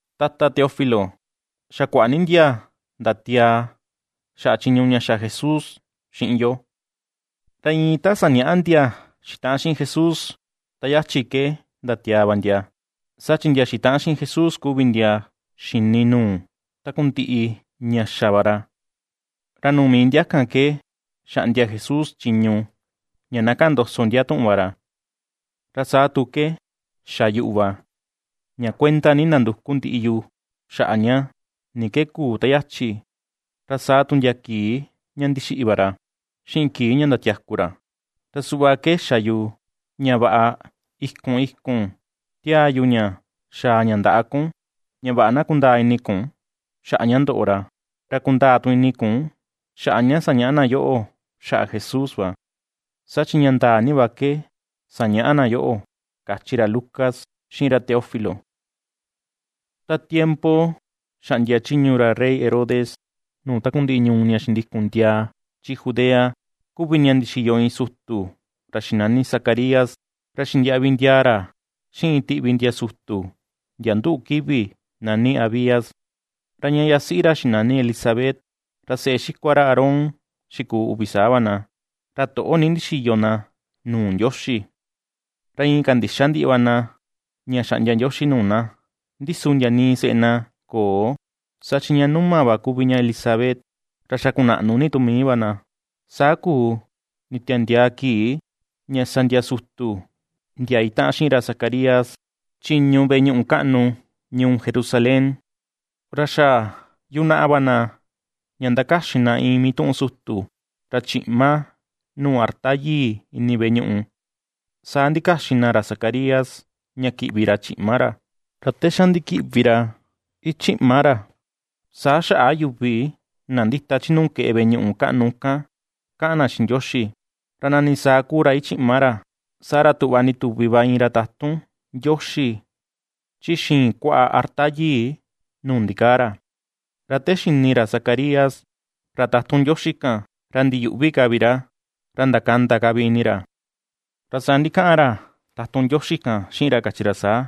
Tata Teófilo, xa kuaꞌa ni ndia ndatiaa xaꞌa chiñu ña xa Jesús xiꞌin yo. Ra iin ta sañaꞌa ndia xitaꞌan xiꞌin Jesús ta yachi ke ndatiaa va ndia, saa chi ndia xitaꞌan xiꞌin Jesús kuvi ndia xini nuu takundiꞌi ña xa va ra, ra nuu mii ndia kan ke xaꞌndia Jesús chiñu ña na kaꞌan ndoso ndia tuꞌun va ra. Ra saa tu ke xa yuꞌu va, ña kuenda ni ndanduku ndiꞌi yu xaꞌa ña, ni ke kuu ta yachi, ra saa tu ndia kii ña ndixiꞌi va ra xiꞌin kii ña ndatiaku ra. Ra suꞌva ke xa yu ña vaꞌa ikun ikun ^tiaa yu ña xaa ña ndaꞌa kun, ña vaꞌa na kundaa ini kun xaꞌa ña ndoꞌo ra. Ra kundaa tu ini kun xaꞌa ña sañaꞌa na yoꞌo xaꞌa Jesús va. Saa chi ña ndaa ni va ke sañaꞌa na yoꞌo ―kachi ra Lucas xiꞌin ra Teófilo. Ta tiempo xaꞌndia chiñu ra rey Herodes nuu takundiꞌi ñuu ña xindikun ndiaa chi Judea, kuvi ña ndixiyo iin sutu ra xinani Zacarías. Ra xindiaꞌvi ndiaa ra xiꞌin iin tiꞌvi ndia sutu ndia nduꞌu kivi nani Abías. Ra ña yasiꞌi ra xinani Elisabet, ra seꞌe xikua ra Aarón xikuu uvi saa va na. Ra toꞌo ni ndixiyo na nuu Ndioxi. Ra iin kandixa ndiꞌi va na ña xaꞌndia Ndioxi nuu na. Ndi su ndia nii seꞌe na köo, saa chi ña numa va kuvi ña Elisabet. Ra xa kunaꞌnu ni tu mii va na. Saa kuu nditiandiaa kii ña sa ndia sutu ndia itaꞌan xiꞌin ra Zacarías chiñu veꞌe ñuꞌu kaꞌnu ñuu Jerusalén. Ra xa yunaꞌa va na ña ndakaxin na iin mituꞌun sutu, ra chiꞌma nuu arta yii ini veꞌe ñuꞌu. Saa ndikaxin na ra Zacarías ña kiꞌvi ra chiꞌma ra. Ra te xa ndikiꞌvi ra ichiꞌma ra, saa xaꞌa yuvi na ndita chi nuu keꞌe veꞌe ñuꞌu kaꞌnu kan kaꞌan na xiꞌin Ndioxi. Ra nani saa kuu ra ichiꞌma ra, saa ra tuꞌva ndituvi va iin ra tatun Ndioxi chi xiin kuaꞌa arta yii nuu ndikaa ra. Ra te xini ra Zacarías ra tatun Ndioxi kan ra ndiyuꞌvi ka vi ra, ra ndakanda ka vi ini ra. Ra saa ndikaꞌan ra tatun Ndioxi kan xiꞌin ra, kachi ra saa: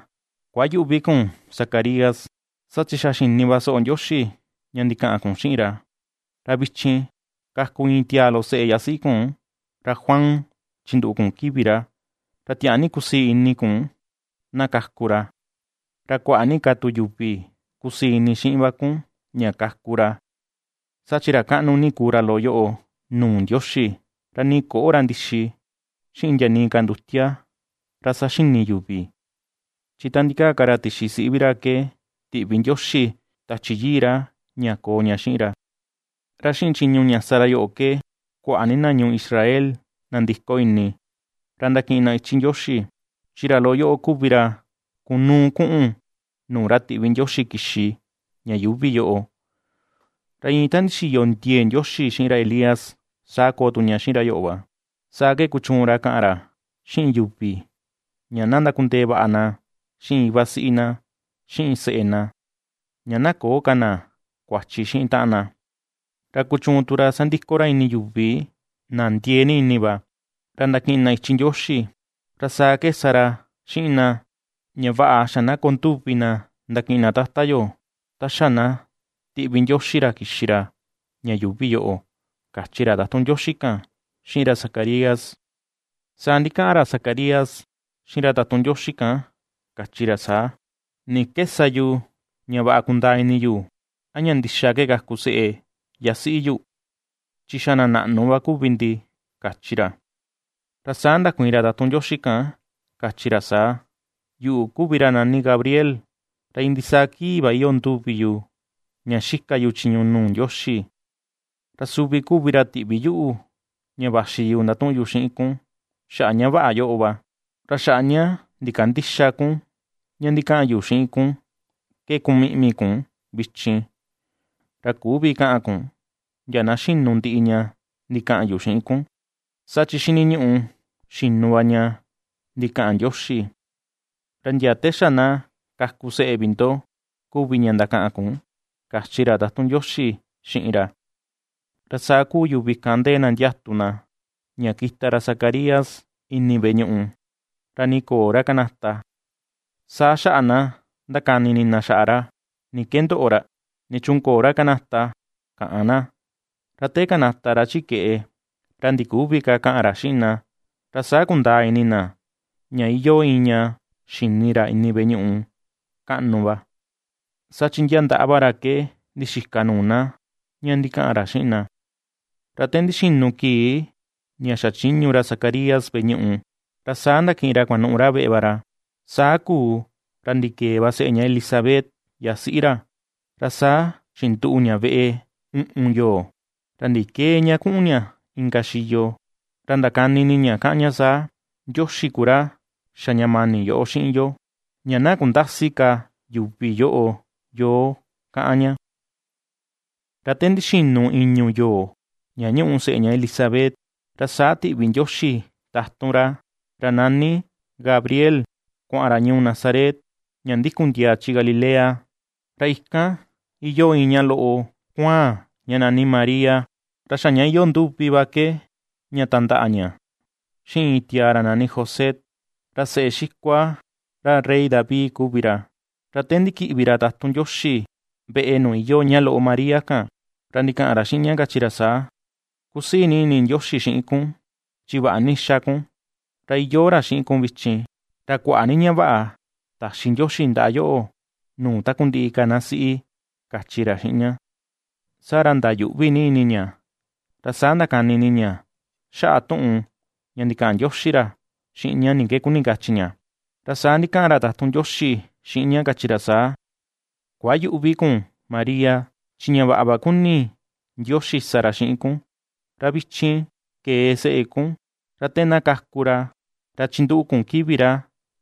―Kuayüꞌvi kun, Zacarías, saa chi xa xini va soꞌo Ndioxi ña ndikaꞌan kun xiꞌin ra. Ra vichin kaku iin tiaa loꞌo seꞌe yasiꞌi kun, ra Juan chinduꞌu kun kivi ra. Ra tiaa ni kusii ini kun na kaku ra. Ra kuaꞌa ni ka tu yuvi kusii ini xiꞌin va kun ña kaku ra. Saa chi ra kaꞌnu ni kuu ra loꞌo yoꞌo nuu Ndioxi; ra nii köꞌo ra ndixi, xiꞌin ndia nii ka ndutia ra saxini yuvi. Chi ta ndikaa ka ra tixi siꞌi vi ra ke, tiꞌvi Ndioxi Tachi Yii ra ña koo ña xiꞌin ra. Ra xiꞌin chiñu ña sa ra yoꞌo ke kuaꞌa ni na ñuu Israel ndandiko ini, ra ndakiꞌin na ichi Ndioxi. Chi ra loꞌo yoꞌo kuvi ra kunuu kuꞌun nuu ra tiꞌvi Ndioxi kixi ña yuuvi yoꞌo. Ra iin ta ndixiyo ndie̱e̱ Ndioxi xiꞌin ra Elías, saa koo tu ña xiꞌin ra yoꞌo va. Saa ke kuchuun ra kaꞌan ra xiꞌin yuvi, ña na ndakundee vaꞌa na xiꞌin iva siꞌi na, xiꞌin seꞌe na; ña na köo ka na kuachi xiꞌin taꞌan na. Ra kuchuun tu ra sandiko ra ini yuvi na ndiee ni ini va, ña ndakiꞌin na ichi Ndioxi. Ra saa ke sa ra xiꞌin na, ña vaꞌa xa na koo nduvi na ndakiꞌin na Tata yo ta xa na tiꞌvi Ndioxi ra kixi ra ña yuvi yoꞌo ―kachi ra tatun Ndioxi kan xiꞌin ra Zacarías. Saa ndikaꞌan ra Zacarías xiꞌin ra tatun Ndioxi kan, kachi ra saa: ―¿Ni ke sa yu ña vaꞌa kundaa ini yu a ña ndixa ke kaku seꞌe yasiꞌi yu? Chi xa na naꞌnu va kuvi ndi ―kachi ra. Ra saa ndakuiin ra tatun Ndioxi kan, kachi ra saa: ―Yuꞌu kuvi ra nani Gabriel. Ra iin ndisaa kii va iyoo nduvi yu ña xika yu chiñu nuu Ndioxi. Ra suvi kuvi ra tiꞌvi yuꞌu ña vaxi yu ndatuꞌun yu xiꞌin kun xaꞌa ña vaꞌa yoꞌo va. Ra xaꞌa ña ndikandïxa kun ña ndikaꞌan yu xiꞌin kun ke kumiꞌmi kun vichin. Ra küvi kaꞌan kun ndia na xinu ndiꞌi ña ndikaꞌan yu xiꞌin kun, saa chi xiniñuꞌu xinu va ña ndikaꞌan Ndioxi. Ra ndia te xa na kaku seꞌe vi ndo, kuvi ña ndakaꞌan kun ―kachi ra tatun Ndioxi xiꞌin ra. Ra saa ^kuu yuvi kan ndee na ndiatu na ña kita ra Zacarías ini veꞌe ñuꞌu, ra nii köo ra kanata. Saa xaꞌa na ^ndakani ini na xaꞌa ra: “¿Ni ke ndoꞌo ra? ¿Nichuun köo ra kanata?”, kaꞌan na. Ra te kanata ra chi keꞌe, ra ndiküvi ka kaꞌan ra xiꞌin na. Ra saa kundaa ini na ña iyoo iin ña xini ra ini veꞌe ñuꞌu kaꞌnu va. Saa chi ndia ndaꞌa va ra ke ndixika nuu na ña ndikaꞌan ra xiꞌin na. Ra te ndixinu kii ña xachiñu ra Zacarías veꞌe ñuꞌu, ra saa ndakiꞌin ra kuanuꞌu ra veꞌe va ra. Saa kuu ra ndikee va seꞌe ña Elisabet, yasiꞌi ra. Ra saa xinduꞌu ña veꞌe uꞌun yoo, ra ndikëe ña kuꞌun ña inka xiyo. Ra ndakani ini ña, kaꞌan ña saa: “Ndioxi ku ra xa ña mani yoꞌo xiꞌin yo, ña na kundäsi ka yuvi yoꞌo yo”, kaꞌan ña. Ra te ndixinu i̱ñu̱ yoo ña ñuꞌu seꞌe ña Elisabet, ra saa tiꞌvi Ndioxi tatun ra, ra nani Gabriel, kuaꞌan ra ñuu Nazaret ña ndikun ndiaa chi Galilea. Ra ikan iyoo iin ñaꞌa loꞌo kuaan ña nani María. Ra xa ña iyoo nduvi va ke ña tandaꞌa ña xiꞌin iin tiaa ra nani José. Ra seꞌe xikua ra rey David kuvi ra. Ra te ndikiꞌvi ra tatun Ndioxi veꞌe nuu iyoo ña loꞌo María kan, ra ndikaꞌan ra xiꞌin ña, kachi ra saa: ―Kusii ni ini Ndioxi xiꞌin kun chi vaꞌa ni ^xa kun, ra iyoo ra xiꞌin kun vichin; ra kuaꞌa ni ña vaꞌa taxi Ndioxi ndaꞌa yoꞌo nuu takundiꞌi ka na siꞌi ―kachi ra xiꞌin ña. Saa ra ndayuꞌvi ni ini ña, ra saa ndakani ini ña xaꞌa tuꞌun ña ndikaꞌan ndioxi ra xiꞌin ña ni ke kuni kachi ña. Ra saa ndikaꞌan ra tatun Ndioxi xiꞌin ña, kachi ra saa: ―Kuayüꞌvi kun María, chi ña vaꞌa va kuni Ndioxi sa ra xiꞌin kun. Ra vichin kee seꞌe kun. Ra te na kaku ra, ra chinduꞌu kun kivi ra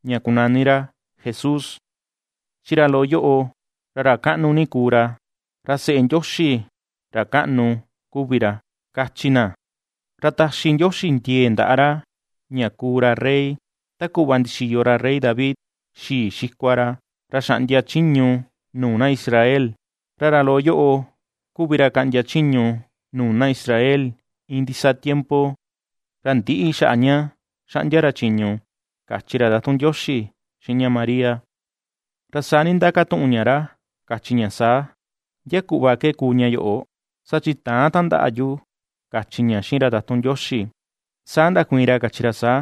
ña kunani ra Jesús. Chi ra loꞌo yoꞌo, ra ra kaꞌnu ni kuu ra, ra “Seꞌe Ndioxi Ra Kaꞌnu kuvi ra” kachi na. Ra taxi Ndioxi ndie̱e̱ ndaꞌa ra, ña kuu ra rey, ta kuꞌva ndixiyo ra rey David, xii xikua ra, ra xaꞌndia chiñu nuu na Israel. Ra ra loꞌo yoꞌo kuvi ra kaꞌndia chiñu nuu na Israel iin ndisaa tiempo; ra ndïꞌi xaꞌa ña xaꞌndia ra chiñu ―kachi ra tatun Ndioxi xiꞌin ña María. Ra saa ndindakatuꞌun ña ra, kachi ña saa: ―¿Ndia kuꞌva ke kuu ña yoꞌo? Saa chi täan tandaꞌa yu ―kachi ña xiꞌin ra tatun Ndioxi. Saa ndakuiin ra, kachi ra saa: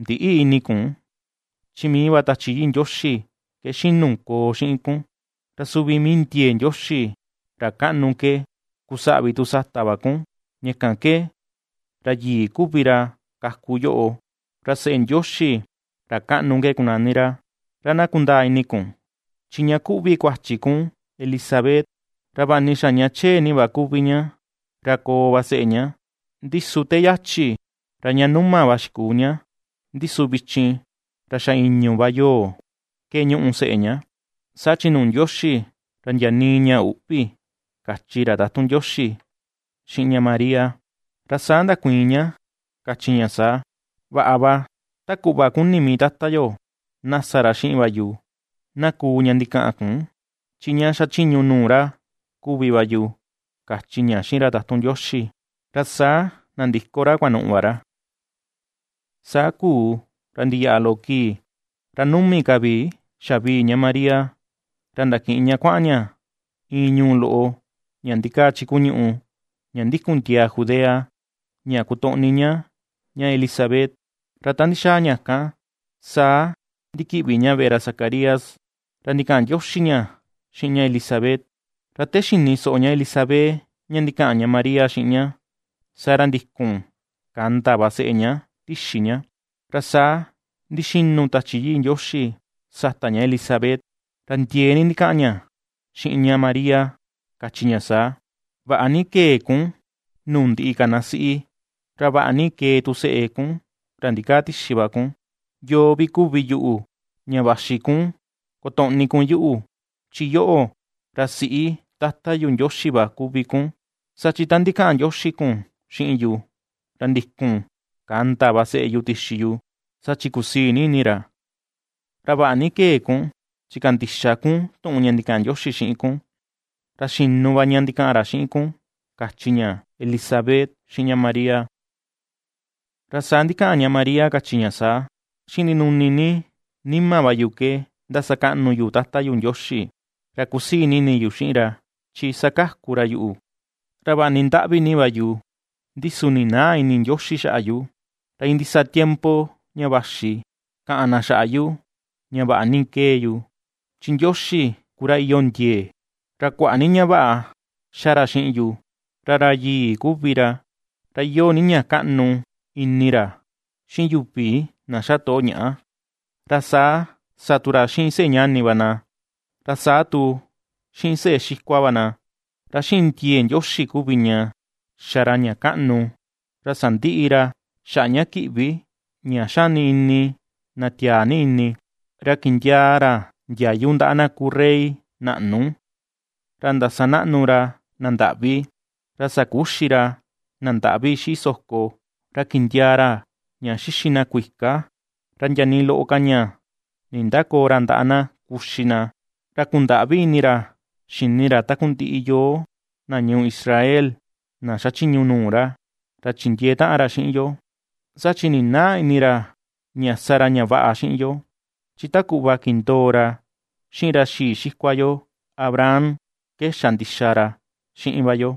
―Ndïꞌi ini kun, chi mii va Tachi Yii Ndioxi ke xinu koo xiꞌin kun; ra suvi mii ndiee Ndioxi, ra kaꞌnu ke kusaꞌvi tu sata va kun. Ña kan ke ra Yii kuvi ra kaku yoꞌo, ra Seꞌe Ndioxi, ra kaꞌnu ke kunani ra. Ra na kundaa ini kun chi ña kuꞌvi kuachi kun, Elisabet, ra vaꞌa ni xa ña chee kuvi va ña, ra koo va seꞌe ña. Ndi su te yachi, ra ña numa va xikuu ña, ndi su vichin, ra xa i̱ñu̱ va yoo ke ñuꞌu seꞌe ña. Saa chi nuu Ndioxi ra ndia nii ña üꞌvi ―kachi ra tatun Ndioxi xiꞌin ña María. Ra saa ndakuiin ña, kachi ña saa: ―Vaꞌa va, ta kuꞌva kuni mii Tata yo, na sa ra xiꞌin va yu. Na kuu ña ndikaꞌan kun, chi ña xa chiñu nuu ra kuvi va yu ―kachi ña xiꞌin ra tatun Ndioxi. Ra saa nandiko ra kuanuꞌu va ra. Saa kuu ra ndiyaꞌa loꞌo kii ra numi ka vi xavii ña María ra ndakiꞌin ña kuaꞌan ña iin ñuu loꞌo ña ndikaa chi kuñuꞌu ña ndikun ndiaa Judea ña kotoꞌni ña ña Elisabet. Ra ta ndixaa ña kan, saa ndikiꞌvi ña veꞌe ra Zacarías. Ra ndikaꞌan ndioxi ña xiꞌin ña Elisabet. Ra te xini soꞌo ña Elisabet ña ndikaꞌan ña María xiꞌin ña, saa ra ndikun kanda va seꞌe ña tixi ña. Ra saa ndixinu Tachi Yii Ndioxi sata ña Elisabet, ra ndiee ni ndikaꞌan ña xiꞌin ña María, kachi ña saa: ―Vaꞌa ni kee kun nuu ndiꞌi ka na siꞌi, ra vaꞌa ni kee tu seꞌe kun, ra ndikaa tixi va kun. ¿Yoo vi ku yuꞌu ña vaxi kun kotoꞌni kun yuꞌu? Chi yoꞌo, ra siꞌi Tata yu Ndioxi va kuvi kun. Saa chi ta ndikaꞌan ndioxi kun xiꞌin yu, ra ndikun kanda va seꞌe yu tixi yu, saa chi kusii ni ini ra. Ra vaꞌa ni kee kun, chi kandixa kun tuꞌun ña ndikaꞌan Ndioxi xiꞌin kun. Ra xinu va ña ndikaꞌan ra xiꞌin kun ―kachi ña Elisabet xiꞌin ña María. Ra saa ndikaꞌan ña María, kachi ña saa: ―Xiꞌin ndinuni ni nima va yu ke ndasakaꞌnu yu Tata yu Ndioxi. Ra kusii ni ini yu xiꞌin ra, chi ^sakaku ra yuꞌu. Ra vaꞌa ni ndaꞌvi ni va yu, ndi su ninäa ini Ndioxi xaꞌa yu. Ra iin ndisaa tiempo ña vaxi, kaꞌan na xaꞌa yu ña vaꞌa ni ^kee yu. Chi Ndioxi ku ra iyoo ndie̱e̱, ra kuaꞌa ni ña vaꞌa ^xa ra xiꞌin yu; Ra ra yii kuvi ra. Ra iyoo ni ña kaꞌnu ini ra xiꞌin yuvi na xa toꞌo ñaꞌa; ra saa sa tu ra xiꞌin seꞌe ñani va na, ra saa tu xiꞌin seꞌe xikua va na. Ra xiꞌin ndie̱e̱ Ndioxi kuvi ña xa ra ña kaꞌnu; ra sandiꞌi ra xaꞌa ña kiꞌvi, ña xani ini na tiaa ni ini. Ra kindiaa ra ndiayu ndaꞌa na kuu rey naꞌnu. Ra ndasanaꞌnu ra na ndaꞌvi. Ra sakuxi ra na ndaꞌvi xiꞌi soko. Ra kindiaa ra ña xixi na kuika; ra ndia nii loꞌo ka ña nindäkoo ra ndaꞌa na kuxi na. Ra kundaꞌvi ini ra xini ra takundiꞌi yo na ñuu Israel na xachiñu nuu ra; ra chindiee taꞌan ra xiꞌin yo. Saa chi ninäa ini ra ña sa ra ña vaꞌa xiꞌin yo. Chi ta kuꞌva kindoo ra xiꞌin ra xii xikua yo Abraham, ke xa ndixa ra xiꞌin va yo;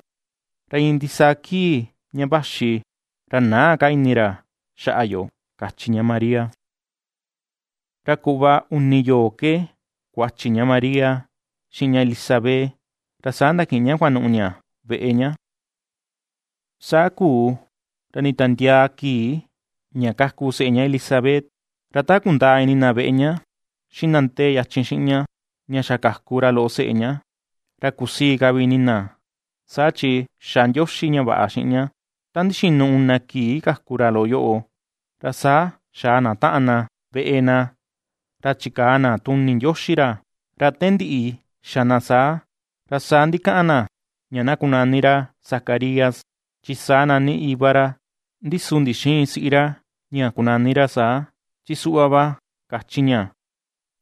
ra iin ndisaa kii ña vaxi ra näa ka ini ra xaꞌa yo ―kachi ña María. Ra kuꞌva uni yoo ke kuachi ña María xiꞌin ña Elisabet, ra saa ndakiꞌin ña kuanuꞌu ña veꞌe ña. Saa kuu ra nditiandiaa kii, ña kaku seꞌe ña Elisabet. Ra ta kundaa ini na veꞌe ña, xiꞌin na ndee yachin xiꞌin ña, ña xa kaku ra loꞌo seꞌe ña, ra kusii ka vi ini na, saa chi xa Ndioxi ña vaꞌa xiꞌin ña. Ta ndixinu una kii kaku ra loꞌo yoꞌo, ra saa xaa na taꞌan na veꞌe na, ra chikaa na tuni Ndioxi ra. Ra te ndiꞌi xa na saa, ra saa ndikaꞌan na ña na kunani ra Zacarías, chi saa nani iva ra. Ndi su ndixïin siꞌi ra ña kunani ra saa, chi suꞌva va kachi ña: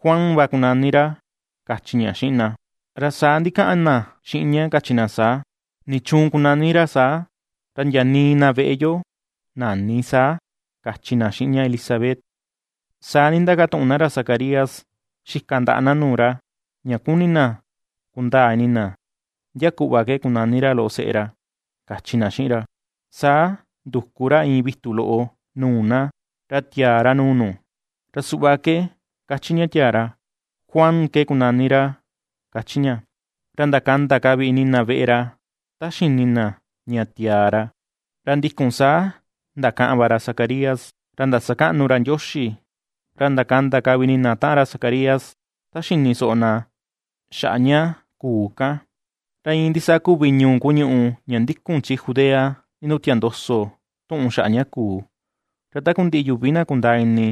―Juan va kunani ra ―kachi ña xiꞌin na. Ra saa ndikaꞌan na xiꞌin ña, kachi na saa: ―¿Nichuun kunani ra saa? Ra ndia nii na veꞌe yo näni saa ―kachi na xiꞌin ña Elisabet. Saa ndindakatuꞌun na ra Zacarías xika ndaꞌa na nuu ra, ña kuni na kundaa ini na ndia kuꞌva ke kunani ra loꞌo seꞌe ra, kachi na xiꞌin ra. Saa nduku ra iin vitu loꞌo nuu na, ra tiaa ra nuu nu. Ra suꞌva ke kachi ña tiaa ra: “Juan ke kunani ra”, kachi ña. Ra ndakanda ka vi ini na veꞌe ra ta xini na ña tiaa ra. Ra ndikun saa ndakaꞌan va ra Zacarías, ra ndasakaꞌnu ra Ndioxi. Ra ndakanda ka vi ini na taꞌan ra Zacarías ta xini soꞌo na xaꞌa ña kuu kan. Ra iin ndisaa kuvi ñuu kuñuꞌu ña ndikun chi Judea ndindutia ndoso tuꞌun xaꞌa ña kuu. Ra takundiꞌi yuvi na kundaa ini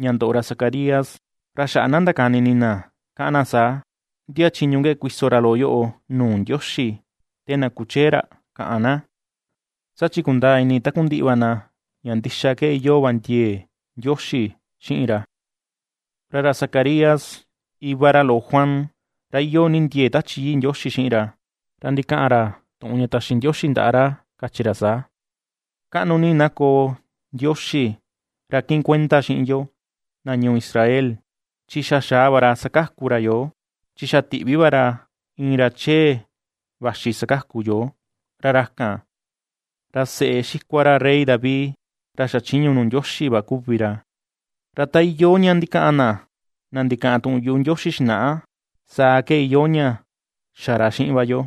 ña ndoꞌo ra Zacarías ra xaꞌa na ndakani ini na, káꞌán na saa: ―¿Ndia chiñu ke kuiso ra loꞌo yoꞌo nuu Ndioxi, te na kuchee ra? ―káꞌán na. Saa chi kundaa ini takundiꞌi va na ña ndixa ke iyoo va ndiee Ndioxi xiꞌin ra. Ra ra Zacarías, iva ra loꞌo Juan, ra iyoo ni ndie̱e̱ Tachi Yii Ndioxi xiꞌin ra, ra ndikaꞌan ra tuꞌun ña taxi Ndioxi ndaꞌa ra, kachi ra saa: Kaꞌnu ni na koo Ndioxi, ra kiꞌin kuenda xiꞌin yoo, na ñuu Israel, chi xa xaa va ra sakaku ra yoo. Chi xa tiꞌvi va ra iin ra chee, vaxi sakaku yoo, ra ra kan, ra seꞌe xikua ra rey David, ra xachiñu nuu Ndioxi va kuvi ra. Ra ta iyoo ña ndikaꞌan na, na ndikaꞌan tuꞌun yuꞌu Ndioxi xinaꞌa, saa ke iyoo ña xa ra xiꞌin va yo.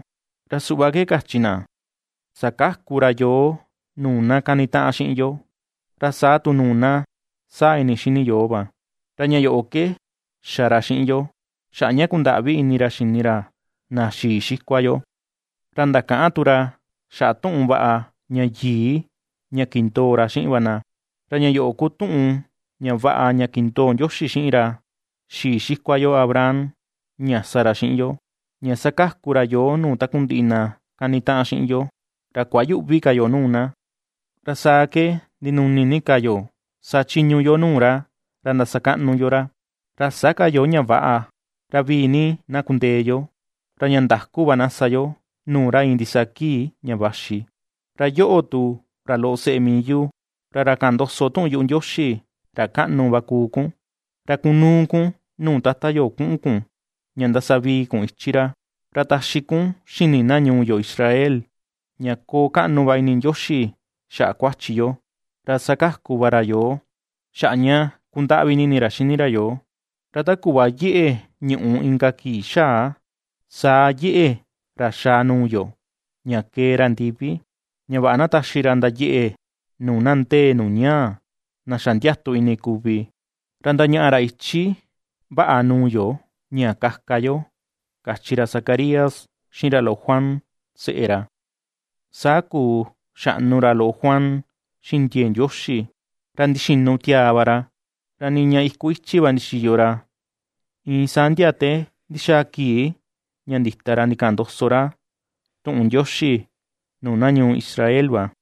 Ra suꞌva kachi na: Sakaku ra yoo nuu na kani taꞌan xiꞌin yo, ra saa tu nuu na sáa̱ ini xini yoo va. Ra ña yoꞌo ke xa ra xiꞌin yo, xaꞌa ña kundaꞌvi ini ra xini ra na xii xikua yo; ra ndakaꞌan tu ra xaꞌa tuꞌun vaꞌa ña yii, ña kindoo ra xiꞌin va na. Ra ña yoꞌo ku tuꞌun ña vaꞌa ña kindoo Ndioxi xiꞌin ra xii xikua yo Abraham, ña sa ra xiꞌin yo: ña sakaku ra yoo nuu takundiꞌi na kani taꞌan xiꞌin yo, ra kuayüꞌvi ka yo nuu na. Ra saa ke ndinuni ni ka yo sachiñu yo nuu ra, ra ndasakaꞌnu yo ra. Ra sä ka yo ña väꞌa, ra vii ni na kundee yo, ra ña ndaku va na sa yo nuu ra iin ndisaa kii ña vaxi. Ra yoꞌo tu, ra loꞌo seꞌe mii yu, ra ra kaꞌan ndoso tuꞌun yuꞌu Ndioxi, ra kaꞌnu, va kuu kun. Ra kunuu kun nuu Tata yo kuꞌun kun ña ndasavii kun ichi ra. Ra taxi kun xini na ñuu yo, Israel, ña koo kaꞌnu va ini Ndioxi xaꞌa kuachi yo, ra sakaku va ra yoo, xaꞌa ña kundaꞌvi ni ini ra xini ra yoo. Ra ta kuꞌva yeꞌe ñuꞌù inka kii xaa, saa yeꞌe ra xaa ra nuu yo, ña kee ra ndivi. Ña vaꞌa na taxi ra ndayeꞌe nuu na ndee nuu ñaa, na xa ndiatu ini kuvi. Ra ndañaꞌa ra ichi vaꞌa nuu yo ña kaka yo, kachi ra Zacarías xiꞌin ra loꞌo Juan seꞌe ra. Saa kuu xaꞌnu ra loꞌo Juan xiꞌin ndiee Ndioxi, ra ndixinu tiaa va ra. Ra niña iku ichi va ndixiyo ra, iin saa ndia te ndixaa kii ña ndita ra ndikaꞌan ndoso ra tuꞌun Ndioxi nuu na ñuu Israel va.